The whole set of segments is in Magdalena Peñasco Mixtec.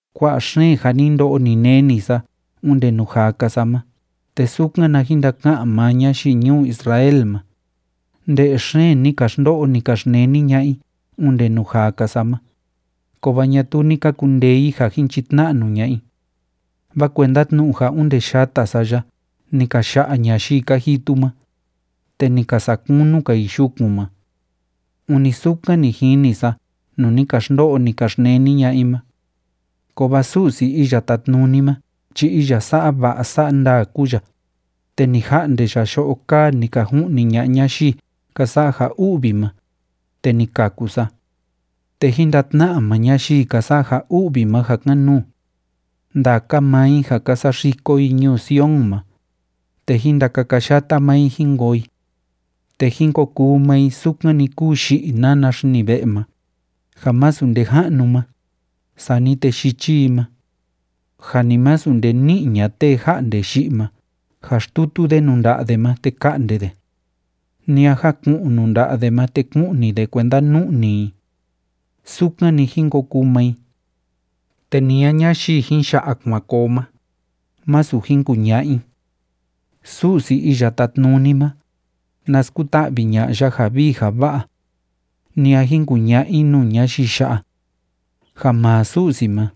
Kua'a xeen ja ni ndo'o, ni neni sa onde nuu jaa‑ka sa ma ―te sukan na jin ndaka'an maa ñayii ñuu Israel ma―, nde'e xeen ni ka xndo'o, ni ka xneni ña'a i onde nuu jaa‑ka sa ma, kovaa ñatuu ni ka kundee i ja jin chitna'nu ña'a i. Vaa kuenda tnu'u ja onde yata sa ya ni ka ya'a ñayii ka jitu ma, te ni ka sa'a kunu‑ka i yukun ma. Ûni sukan ni jini sa nuu ni ka xndo'o, ni ka xneni ña'a i ma. Kovaa Su'si Iya Tátnuni ma chi iya sa'a va'a sa'a ndaa kúu ya, te ni ja'nde ya yo'o kaa ni ka ju'ni ña'a ñayii ka sa'a ja u'vi ma, te ni kaku sa. Te jín ndatna'a maa ñayii ka sa'a ja u'vi ma ja kan‑nuu. Ndaka maa i ja ka saxiko i ñuu Sion ma, te jín ndakakayata maa i jín koo i. Te jín ko kuu maa i sukan‑ni kúu yi'i nana xini ve'e ma, ja masu nde ja'nu ma, sani te yichi i ma. Ja ni masu nde ni'i ña'a tee ja'nde yi'i ma ja xtutu de nuu nda'a de ma te ka'nde de. Ni a jaku'un nuu nda'a de ma te ku'ni de kuenda nu'ni i. Sukan‑ni jín ko kuu maa i. Te ni a ñayii jin ya'a kuan koo ma, masu jin kuña'a i: “Su'si Iya Tátnuni ma, na skuta'vi ña'a ya ja vii ja va'a.” Ni a jin kuña'a i nuu ñayii ya'a: “Ja maa Su'si ma,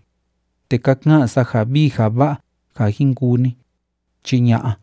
te ka ka'an sa ja vii ja va'a ja jin kuu ni”, chi ña'a.